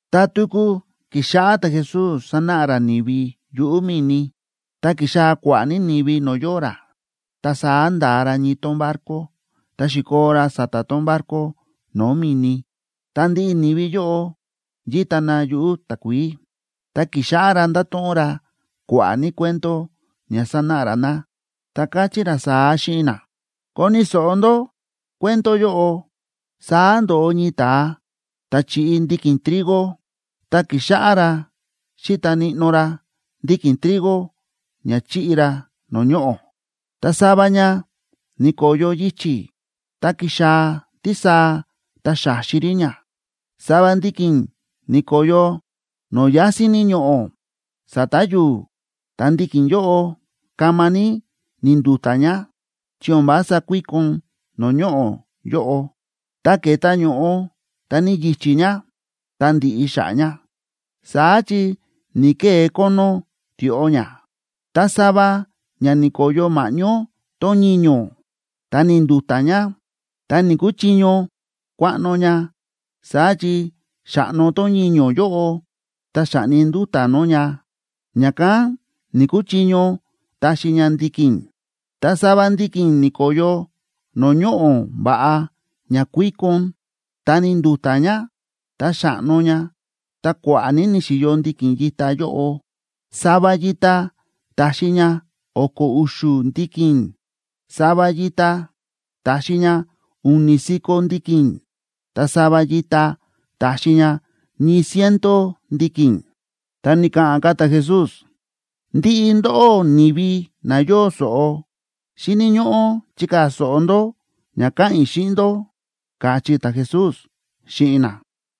Ta tuku ki̱xáꞌá ta̱Jesús sánáꞌa ra ni̱vi yuꞌu̱ mi̱ni. Ta ki̱xaa̱ kua̱ꞌa̱ ní ni̱vi no̱o̱ yóo ra, ta saá nda̱a ra ñii tón barco, ta xi̱koo ra sa̱ta̱ tón barco no̱o̱ mi̱ni, ta ndiꞌi ni̱vi yóꞌo yíta na yuꞌu̱ takuií. Ta ki̱xáꞌá ra ndáto̱ꞌon ra kua̱ꞌa̱ ní cuento ña sanáꞌa ra na, ta káchí ra saá xíꞌin na: ―Koni̱ so̱ꞌo ndó cuento yóꞌo. Saá ndo̱ꞌo ñii ta̱a ta̱ chíꞌi ndiki̱n trigo. Ta ki̱xáꞌá ra xíta níꞌnó ra ndiki̱n trigo ña chiꞌi ra no̱o̱ ñoꞌo̱. Ta sava ña ni̱ko̱yo yichi̱, ta ki̱xaa̱ tísaa ta xa̱xi rí ña. Sava ndiki̱n ni̱ko̱yo no̱o̱ yásín ní ñoꞌo̱ sa̱ta̱ yu̱u̱, ta ndiki̱n yóꞌo kama ní ni̱ndu̱ta̱ ña, chi o̱n vása kuíkon no̱o̱ ñoꞌo̱ yóꞌo. Ta ke̱ta ño̱ꞌo ta ni̱yichí ña, ta ndi̱ꞌi xa̱ꞌa̱ ña, saá chi ni̱‑kee kónó tioꞌo ña. Ta sava ña ni̱ko̱yo ma̱ꞌñó tón ñiño̱, ta ni̱ndu̱ta̱ ña, ta ni̱‑kuchiño kuaꞌno ña, saá chi xa̱ꞌno tón ñiño̱ yóꞌo ta xa̱ꞌni nduta̱ nó ña, ña̱kán ni̱‑kuchiño taxi ña ndiki̱n. Ta sava ndiki̱n ni̱ko̱yo no̱o̱ ñoꞌo̱ va̱ꞌa ña kuíkon. Ta ni̱ndu̱ta̱ ña, ta xa̱ꞌno ña, ta kua̱ꞌa̱ ní ni̱xi̱yo ndiki̱n yita yóꞌo. Sava yita ta̱xi ña o̱ko̱ u̱xu̱ ndiki̱n, sava yita ta̱xi ña u̱ni̱ si̱ko̱ ndiki̱n, ta sava yita ta̱xi ña ñii ciento ndiki̱n. Ta ni̱ka̱ꞌa̱n ka̱ ta̱Jesús: ―Ndiꞌi ndóꞌó ni̱vi na yóo so̱ꞌo, xíni̱ ñóꞌó chikaa̱ so̱ꞌo ndó ña káꞌa̱n i̱ xíꞌin ndó ―káchí ta̱Jesús xíꞌin na.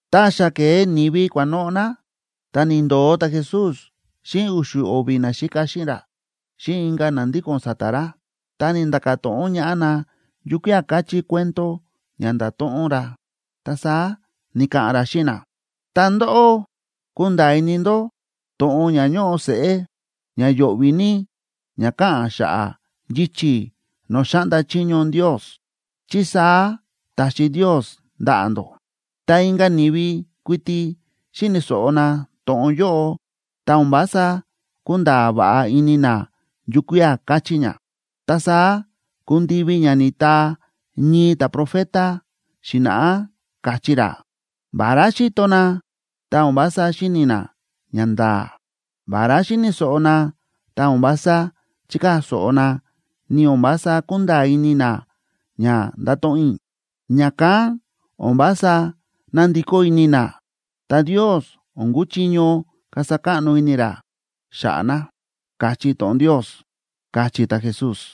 Tá xa ke̱e ni̱vi kua̱noꞌo̱ na, ta ni̱ndo̱o ta̱Jesús xíꞌin u̱xu̱ o̱vi̱ naxíka xíꞌin ra xíꞌin inka̱ na ndíko̱n sa̱ta̱ ra, ta ni̱nda̱ka̱ to̱ꞌon ñaꞌá na yukía̱ káchí cuento ña nda̱to̱ꞌon ra. Ta saá ni̱ka̱ꞌa̱n ra xíꞌin na: ―Ta ndóꞌó kúnda̱a̱ ini ndó to̱ꞌon ña ñóꞌo seꞌé ña yo̱ꞌvi̱ ní ña káꞌa̱n xa̱ꞌa̱ yichi̱ no̱o̱ xáꞌnda chiño Ndios, chi saá ta̱xi Ndios ndaꞌa̱ ndó. Ta inka̱ ni̱vi kuiti xíni̱ so̱ꞌo na to̱ꞌon yóꞌo, ta o̱n vása kúnda̱a̱ va̱ꞌa ini na yukía̱ káchí ña. Ta saá ku̱ndivi ña ni̱taa ñii ta̱profeta xi̱na̱ꞌá, káchí ra: “Vará xíto na, ta o̱n vása xíni̱ na ñanda̱a̱. Vará xíni̱ so̱ꞌo na, ta o̱n vása chíkaa̱ so̱ꞌo na, ni o̱n vása kúnda̱a̱ ini na ña ndáto̱ꞌon i̱. Ña̱kán o̱n vása nándikó ini na, ta Ndios o̱n kúchiño kasa káꞌno ini ra xa̱ꞌa̱ na”, káchí to̱ꞌon Ndios ―káchí ta̱Jesús.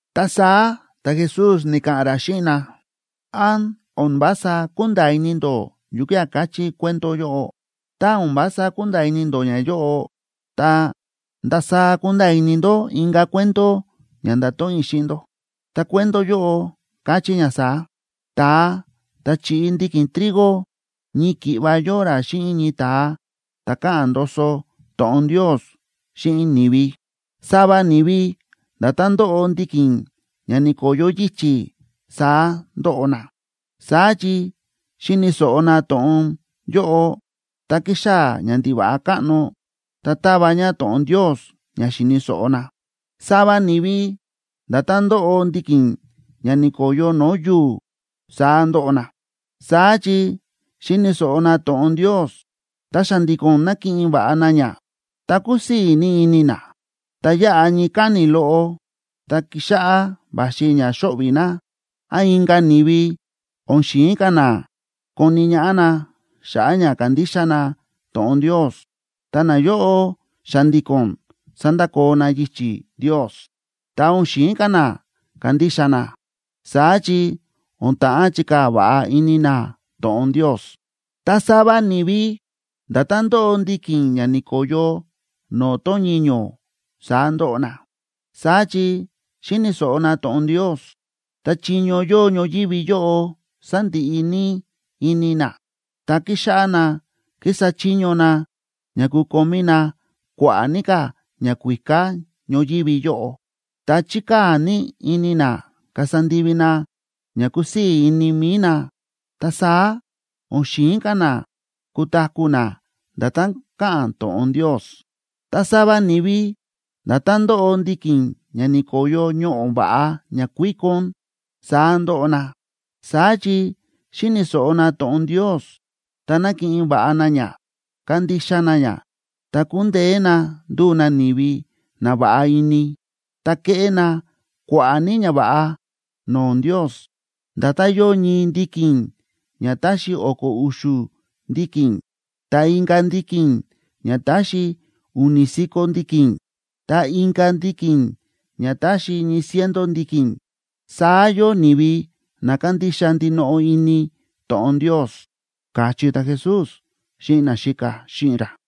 Ta saá ta̱Jesús ni̱ka̱ꞌa̱n ra xíꞌin na: ―¿Án o̱n vása kúnda̱a̱ ini ndó yukía̱ káchí cuento yóꞌo? Tá o̱n vása kúnda̱a̱ ini ndó ñayóꞌo, ta, ¿ndasaá kunda̱a̱ ini ndó inka̱ cuento ña ndato̱ꞌon i̱ xíꞌin ndó? Ta cuento yóꞌo káchí ña saá: Ta̱a ta̱ chíꞌi ndiki̱n trigo ñii ki̱ꞌva yóo ra xíꞌin ñii ta̱a ta̱ káꞌa̱n ndoso to̱ꞌon Ndios xíꞌin ni̱vi. Sava ni̱vi nda̱tán ndóꞌo ndiki̱n ña ni̱ko̱yo yichi̱, saá ndóꞌo na. Saá chi xíni̱ so̱ꞌo na to̱ꞌon yóꞌo, ta kíxaa̱ ñandiva̱ꞌa káꞌno ta táva ña to̱ꞌon Ndios ña xi̱ni̱ so̱ꞌo na. Sava ni̱vi nda̱tán ndóꞌo ndiki̱n ña ni̱ko̱yo no̱o̱ yu̱u̱, saá ndóꞌo na. Saá chi xíni̱ so̱ꞌo na to̱ꞌon Ndios, ta xa̱ndi̱ko̱n nákiꞌin va̱ꞌa na ña, ta kúsii̱ ní ini na. Ta yáꞌa ñii káni̱ loꞌo, tá kíxáꞌá va̱xi ña xóꞌvi̱ na, án inka̱ ni̱vi o̱n xi̱in ka̱ na koni ñaꞌá na xa̱ꞌa̱ ña kándixa na to̱ꞌon Ndios, ta nayóꞌo xa̱ndi̱ko̱n sándakoo na yichi̱ Ndios, ta o̱n xi̱in ka̱ na kandixa na, saá chi o̱n ta̱ꞌán chikaa̱ va̱ꞌa ini na to̱ꞌon Ndios. Ta sava ni̱vi nda̱tán ndóꞌo ndiki̱n ña ni̱ko̱yo no̱o̱ tón ñiño̱, saá ndóꞌo na. Saá chi xíni̱ so̱ꞌo na to̱ꞌon Ndios, ta chiño yóo ñoyívi yóꞌo sándiꞌi ní ini na, ta kíxáꞌá na kísa chiño na ña kukomí na kua̱ꞌa̱ ní ka̱ ñakuíká ñoyívi yóꞌo, ta chíkaa̱ ní ini na kasa ndivi na ña kúsii̱ ini mi̱i na, ta saá o̱n xi̱in ka̱ na kutaku̱ na nda̱tán káꞌa̱n to̱ꞌon Ndios. Ta sava ni̱vi nda̱tán ndóꞌo ndiki̱n ña ni̱ko̱yo ñoꞌo̱ va̱ꞌa ña kuíkon, saá ndóꞌo na. Saá chi xíni̱ so̱ꞌo na to̱ꞌon Ndios, ta nákiꞌin va̱ꞌa na ña, kándixa na ña, ta kúndeé na nduu na ni̱vi na va̱ꞌa ini, ta kéꞌé na kua̱ꞌa̱ ní ñava̱ꞌa no̱o̱ Ndios. Nda̱tán yóo ñii ndiki̱n ña táxi o̱ko̱ u̱xu̱ ndiki̱n, ta inka̱ ndiki̱n ña táxi u̱ni̱ si̱ko̱ ndiki̱n, ta inka̱ ndiki̱n ña táxi ñii ciento ndiki̱n, saá yóo ni̱vi na kándixa ndinoꞌo ini to̱ꞌon Ndios ―káchí ta̱Jesús xíꞌin naxíka xíꞌin ra.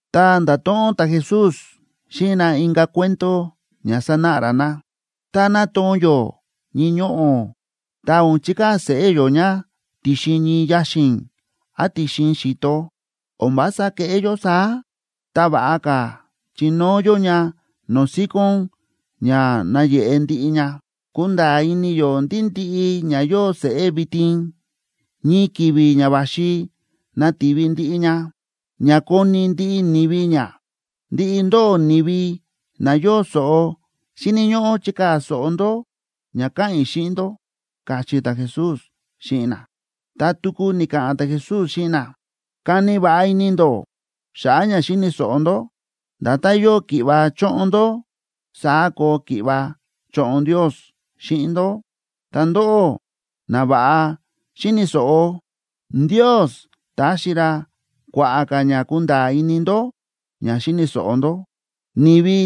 Ta nda̱to̱ꞌon ta̱Jesús xíꞌin na inka̱ cuento ña sanáꞌa ra na: ―Tá nátoo̱n yó ñii ñoꞌo̱, ta o̱n chikaa̱ seꞌé yó ña ti̱xin ñii yaxi̱n án ti̱xin xi̱to. O̱n vása kéꞌé yó saá, ta va̱ꞌa ka̱ chinóo yó ña no̱o̱ síkón ña nayeꞌe ndiꞌi ña. Kúnda̱a̱ ini yó ndí ndiꞌi ña yóo seꞌé vitin, ñii ki̱vi̱ ña va̱xi nativi ndiꞌi ña, ña koni̱ ndiꞌi ni̱vi ña. Ndiꞌi ndóꞌó ni̱vi na yóo so̱ꞌo, xíni̱ ñóꞌó chikaa̱ so̱ꞌo ndó ña káꞌa̱n i̱ xíꞌin ndó ―káchí ta̱Jesús xíꞌin na. Ta tuku ni̱ka̱ꞌa̱n ta̱Jesús xíꞌin na: ―Kani va̱ꞌa ini ndó xa̱ꞌa̱ ña xíni̱ so̱ꞌo ndó. Nda̱tán yóo ki̱ꞌva choꞌon ndó, saá koo ki̱ꞌva choꞌon Ndios xíꞌin ndó. Ta ndóꞌó na va̱ꞌa xíni̱ so̱ꞌo, Ndios taxi ra kua̱ꞌa̱ ka̱ ña kunda̱a̱ ini ndó ña xíni̱ so̱ꞌo ndó. Ni̱vi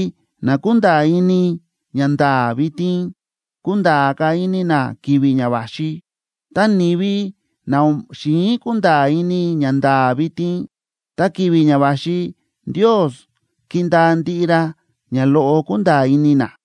na kúnda̱a̱ ini ñanda̱a̱ vitin, kunda̱a̱ ka̱ ini na ki̱vi̱ ña va̱xi, ta ni̱vi na o̱n xi̱in kunda̱a̱ ini ñanda̱a̱ vitin, ta ki̱vi̱ ña va̱xi Ndios kindaa ndiꞌi ra ña loꞌo kúnda̱a̱ ini na.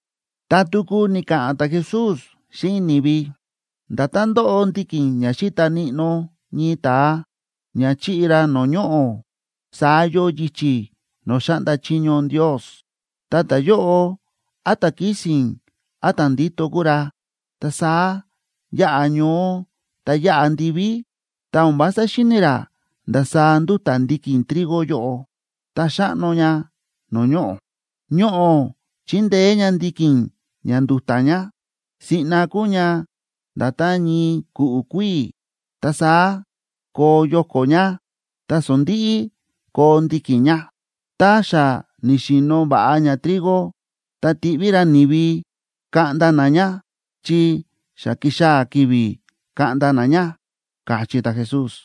Ta tuku ni̱ka̱ꞌa̱n ta̱Jesús xíꞌin ni̱vi: ―Nda̱tán ndóꞌo ndiki̱n ña xi̱ta níꞌnó ñii ta̱a ña chi̱ꞌi ra no̱o̱ ñoꞌo̱, saá yóo yichi̱ no̱o̱ xáꞌnda chiño Ndios. Ta ta̱yóꞌo án ta̱ kísi̱n án ta̱ ndíto kúu ra, ta saá yáꞌa ñoó ta yáꞌa ndiví, ta o̱n vása xíni̱ ra ndasaá ndúta̱ ndiki̱n trigo yóꞌo, ta xáꞌno ña no̱o̱ ñoꞌo̱. Ñoꞌo̱ chíndeé ña ndiki̱n ña ndu̱ta̱ ña; siꞌna kuu ña nda̱tán ñii ku̱ꞌu̱ kuíi̱, ta saá koo yoko̱ ña, ta sondi̱ꞌi koo ndiki̱n ña. Tá xa ni̱xi̱no̱ va̱ꞌa ña trigo, ta tíꞌví ra ni̱vi kaꞌnda na ña, chi xa ki̱xaa̱ ki̱vi̱ kaꞌnda na ña ―káchí ta̱Jesús.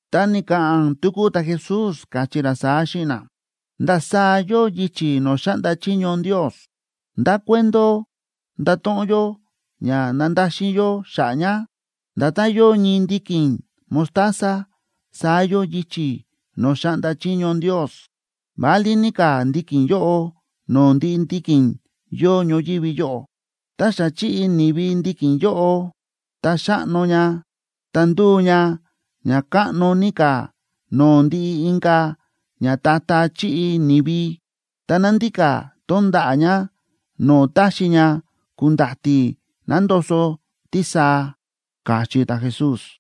Ta ni̱ka̱ꞌa̱n tuku ta̱Jesús, káchí ra saá xíꞌin na: ―¿Ndasaá yóo yichi̱ no̱o̱ xáꞌnda chiño Ndios? ¿Ndá cuento ndato̱ꞌon yó ña nandaxin yó xa̱ꞌa̱ ña? Nda̱tán yóo ñii ndiki̱n mostaza, saá yóo yichi̱ no̱o̱ xáꞌnda chiño Ndios. Válí ní ka̱ ndiki̱n yóꞌo no̱o̱ ndiꞌi ndiki̱n yóo ñoyívi yóꞌo. Tá xa chi̱ꞌi ni̱vi ndiki̱n yóꞌo, ta xáꞌno ña ta ndúu ña ña káꞌno ní ka̱ no̱o̱ ndiꞌi inka̱ ñata̱ta̱ chíꞌi ni̱vi. Ta nándika tón ndaꞌa̱ ña no̱o̱ táxi ña ku̱nda̱ti̱ nandoso tísaa ―káchí ta̱Jesús.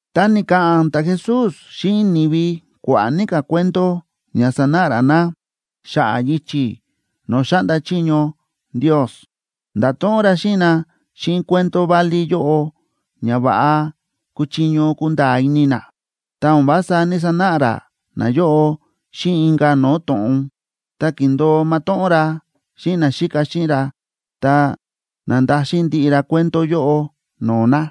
Ta ni̱ka̱ꞌa̱n ta̱Jesús xíꞌin ni̱vi kua̱ꞌa̱ ní ka̱ cuento ña sanáꞌa ra na xa̱ꞌa̱ yichi̱ no̱o̱ xáꞌnda chiño Ndios. Nda̱to̱ꞌon ra xíꞌin na xíꞌin cuento válí yóꞌo ña va̱ꞌa kúchiño kunda̱a̱ ini na. Ta o̱n vása ní‑sanáꞌa ra nayóꞌo xíꞌin inka̱ no̱o̱ to̱ꞌon. Tá kíndo̱o matóꞌón ra xíꞌin naxíka xíꞌin ra, ta na̱ndaxin ndiꞌi ra cuento yóꞌo no̱o̱ na.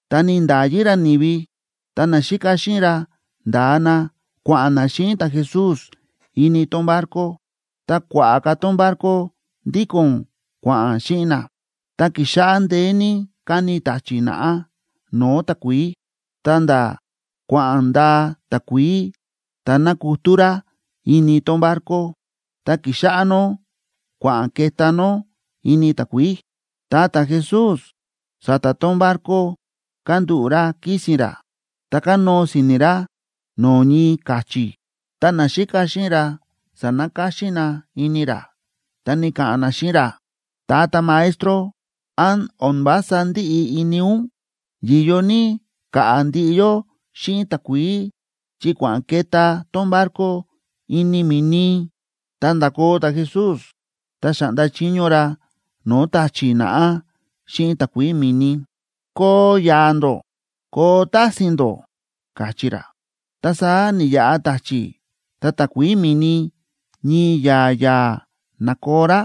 Ta ni̱nda̱yi ra ni̱vi, ta naxíka xíꞌin ra nda̱a na kua̱ꞌa̱n na xíꞌin ta̱Jesús ini tón barco. Ta kua̱ꞌa̱ ka̱ tón barco ndíko̱n kua̱ꞌa̱n xíꞌin na. Ta ki̱xáꞌá ndeé ní káni ta̱chi̱ naꞌá no̱o̱ takuií, ta̱nda̱ kua̱ꞌa̱n ndaa takuií ta na̱kutú rá ini tón barco, ta ki̱xáꞌá nó kua̱ꞌa̱n ke̱tá nó ini takuií. Ta ta̱Jesús sa̱ta̱ tón barco kándúꞌu̱ ra kísi̱n ra ta kánóo si̱ni̱ ra no̱o̱ ñii ka̱chi̱. Ta naxíka xíꞌin ra sa̱nakáxín na ini ra, ta ni̱ka̱ꞌa̱n na xíꞌin ra: ―¡Tata Maestro! ¿Án o̱n vása ndíꞌi ini ún, yi̱yo ní ka̱ꞌa̱ ndiꞌi yó xíꞌin takuií, chi kua̱ꞌa̱n ke̱tá tón barco ini mi̱ni? Ta nda̱koo ta̱Jesús, ta xa̱ꞌnda chiño ra no̱o̱ ta̱chi̱ naꞌá xíꞌin takuií mi̱ni: ―¡Koo ya̱a̱ ndó, koo tási̱ín ndó! ―káchí ra. Ta saá ni̱ya̱a̱ ta̱chi̱ ta takuií mi̱ni ñii ya̱a̱ ya̱a̱ na̱koo rá.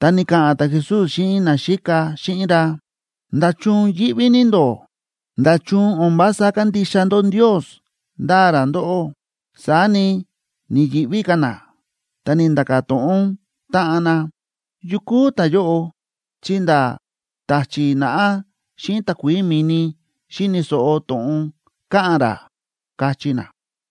Ta ni̱ka̱ꞌa̱n ta̱Jesús xíꞌin naxíka xíꞌin ra: ―¿Nda̱chun yíꞌví ní ndó? ¿Nda̱chun o̱n vása kándixa ndó Ndios ndáa ra ndóꞌó? Saá ni, ni̱yi̱ꞌví ka̱ na, ta ni̱nda̱ka̱ to̱ꞌon táꞌan na: ―¿Yu kúu ta̱yóꞌo? ¡Chi nda̱ ta̱chi̱ naꞌá xíꞌin takuií mi̱ni xíni̱ so̱ꞌo to̱ꞌon káꞌa̱n ra! ―káchí na.